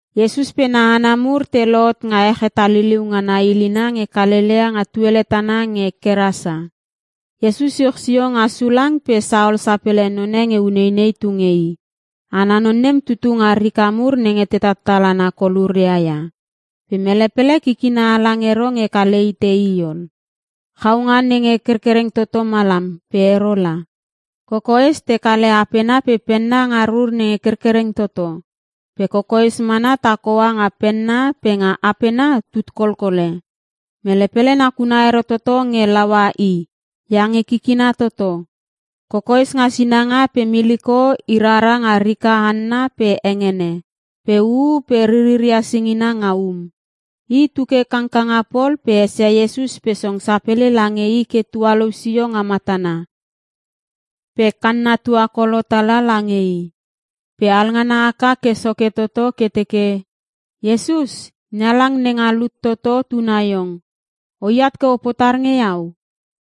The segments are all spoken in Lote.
Iesus pe na hana mur te lohot nga ech hetaliliu ngana ilina nge Kalelea nga tuele tana nge Kerasa. Iesus iuch sio nga sulang pe saol sapele none nge uneinei tu nge i. Ana non nem tutu nga rika mur nenge te tattal hana koluria ia. Pe mele pele kikina halang ero nge kale hite i ol. Chaunga nenge kerkereng toto malam pe ero la. Kokoes, te kale apena pe penna nga rur nenge kerkereng toto. Pe kokoes mana takhoa nga penna pe nga apena tutkolkole. Mele pele nakuna ero toto nge laua i iange kikina toto. Kokoes nga sinanga pe miliko i rara nga rika hanna pe hengene, pe uu pe ririria singina nga um. I tu ke kangkanga pol pe esia Iesus pe song sapele lange i ke tualou sio nga matana pe kanna tuakolo tala lange i. Pe alngana haka ke soke toto ke teke, “Iesus, NeHalang nenga lut toto tuna iong! Oat ke o potar nge iau?”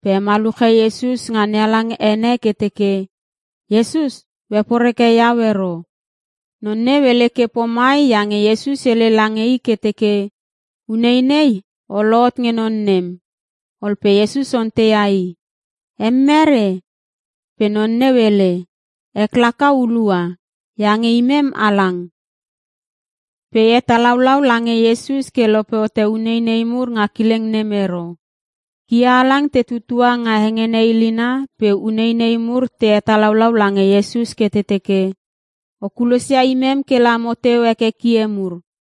Pe hemaluche Iesus nga NeHalang ene ke teke, “Iesus o heporeke iau ero!” Non neu hele ke pomai iange Iesus hele lange i ke teke, “Uneinei o lohot nge non nem.” Ol pe Iesus onteia i, “Em mere?” Pe non neu hele, “Ek laka ‘Hulua’ iange imem halang.” Pe helaulau lange Iesus ke lope hote uneinei mur nga kileng nem ero. Kie halang te tutua nga hengene ilina pe uneinei mur te helaulau lange Iesus ke te teke, “O kulosia imem kela mo teu heke kie mur.”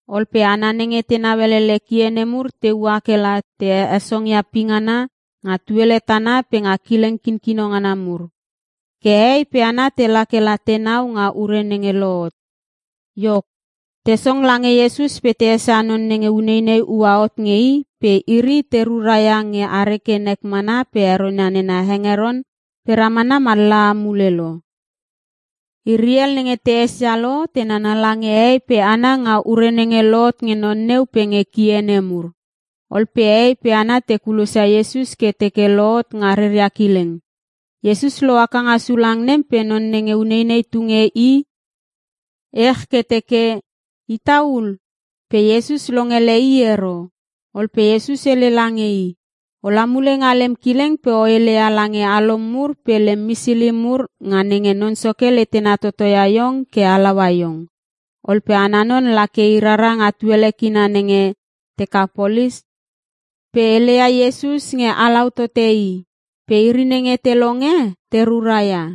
Ol pe hana nenge tenau elele kie nemur te ua kela te hesongia pingana nga tuele tana pe nga kileng kinkino ngana mur. Ke hehei pe hana tela kela tenau nga ure nenge lohot. Iok, te song lange Iesus pe te esia non nenge uneinei ua hot nge i, pe iri te ruraia nge are ke nek mana pe heronia nena hengeron pe ramana mallaha mule lo. Iri hel nenge te esia lo te nana lange hehei pe hana nga ure nenge lohot nge non neu pe nge kie nemur. Ol pe hehei pe hana te kulosia Iesus ke teke lohot nga reria kileng. Iesus lohaka nga sulang nem pe non nenge uneinei tu nge i ech ke teke, “Ita ul!” Pe Iesus longele i ero. Ol pe Iesus hele lange i, “Ola mule nga lem kileng pe o heleia lange alom mur pe lem misili mur nga nenge Non Soke letena toto ia iong ke halaua iong.” Ol pe ana non la ke i rara nga tuele kina nenge Tekapolis, pe heleia Iesus nge halaua tote i pe iri nenge te longe te ruraia.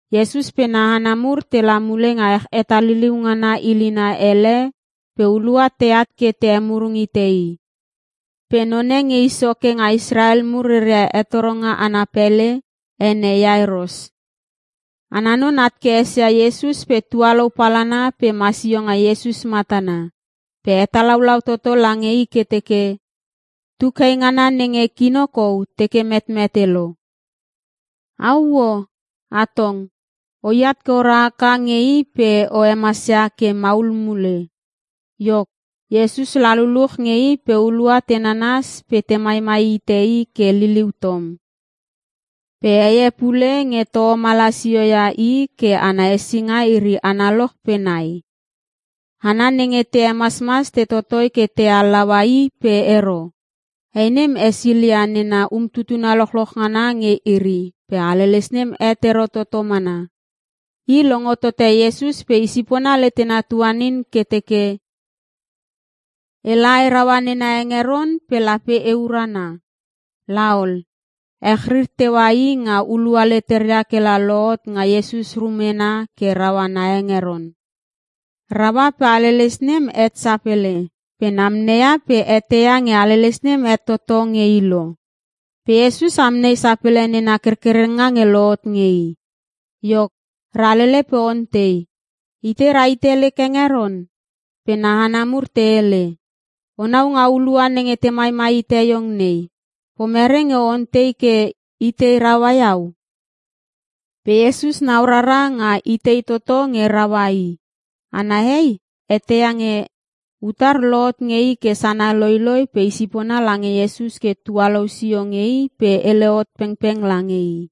Iesus pe na hana mur tela mule nga ech hetaliliu ngana ilina hele pe hulua teat ke te hemurung hite i. Pe none nge i soke nga Israel mur reria hetoronga ana pele, ene Iairos. Ana non at ke esia Iesus pe tualou palana pe ma sio nga Iesus matana. Pe hetalaulau toto lange i ke teke, “Tuk hei ngana nenge kino kou teke metmete lo. Auo! Atong, oi at ke ora haka nge i pe o hemasia ke maul mule!” Iok, Iesus la luluch nge i pe hulua te nanas pe te maimai hite i ke liliu tom. Pe hei e pule nge toho malasioia i ke ana hesinga iri analoch pe nai. Hana nenge te hemasmas te totoi ke te halaua i pe ero. Hei nem esilia nena umtutuna lochloch ngana nge iri pe haleles nem het ero toto mana. I longo tote Iesus pe isipona letena tuanin ke teke, “Ela, e raua nena hengeron pe lape e urana.” La ol, echrir teua i nga hulua leteria kela lohot nga Iesus rumena ke raua na hengeron. Raua pe haleles nem het sapele pe namneia pe eteia nge haleles nem het toto nge i lo. Pe Iesus amnei sapele nena kerkerenga nge lohot nge i. Iok, ralele pe ontei, “Itei rahite lek hengeron?” Pe na hana mur te hele, “O nau nga hulua nenge te maimai hite iong nei. Pomere nge o ontei ke, ‘Itei raua iau?’” Pe Iesus nau rara nga itei toto nge raua i. Ana hei eteia nge utar lohot nge i ke sana loiloi pe isipona lange Iesus ke tualousio nge i pe hele hot pengpeng lange i.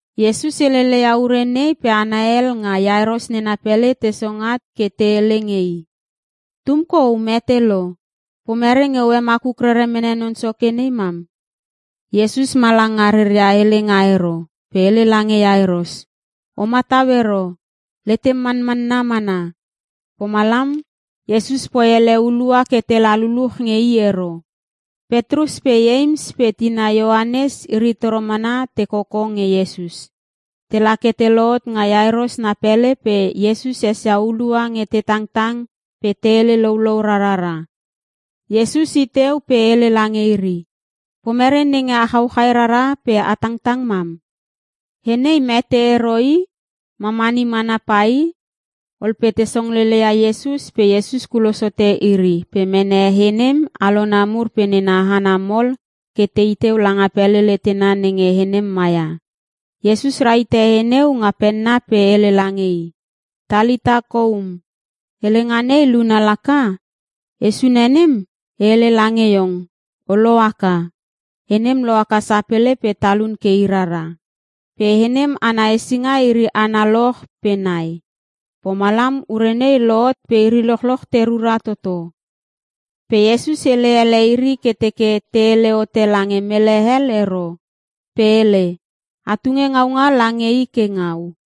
Iesus heleleia ure nei pe hana hel nga Iairos nena pele te song at ke te hele nge i, “Tum kou mete lo, pomere nge o hemakuk rere mene Non Soke ne mam?” Iesus ma langa reria helenga ero pe hele lange Iairos, “O matau ero, letem manmanna mana.” Pomalam, Iesus poi ele hulua ke tela luluch nge i ero. Petrus pe Ieims pe tina Ioanes iri toro mana te koko nge Iesus. Tela ke te lohot nga Iairos na pele pe Iesus esia hulua nge te tangtang pe te hele loulou rarara. Iesus i teu pe hele lange iri, “Pomere nenge a chauchai rara pe a tangtang mam? He nei mete ero i. Mamani mana pai!” Ol pe te songlele ia Iesus pe Iesus kulos hote iri pe mene he nem alona mur pe nena hana mol ke tei teu langa pele letena nenge he nem maia. Iesus rahite he neu nga penna pe hele lange i, “Talitha koum.” helenga nei luna laka, “He sune nem e hele lange iong, o lohaka.” He nem lohaka sapele pe talun ke i rara. (Pe he nem ana hesinga iri analoch pe nai) Pomalam ure nei lohot pe iri lochoch te rura toto. Pe Iesus hele ele iri ke teke te hele hote lange mele hel ero. Pe hele, “A tunge ngaunga lange i ke ngau.”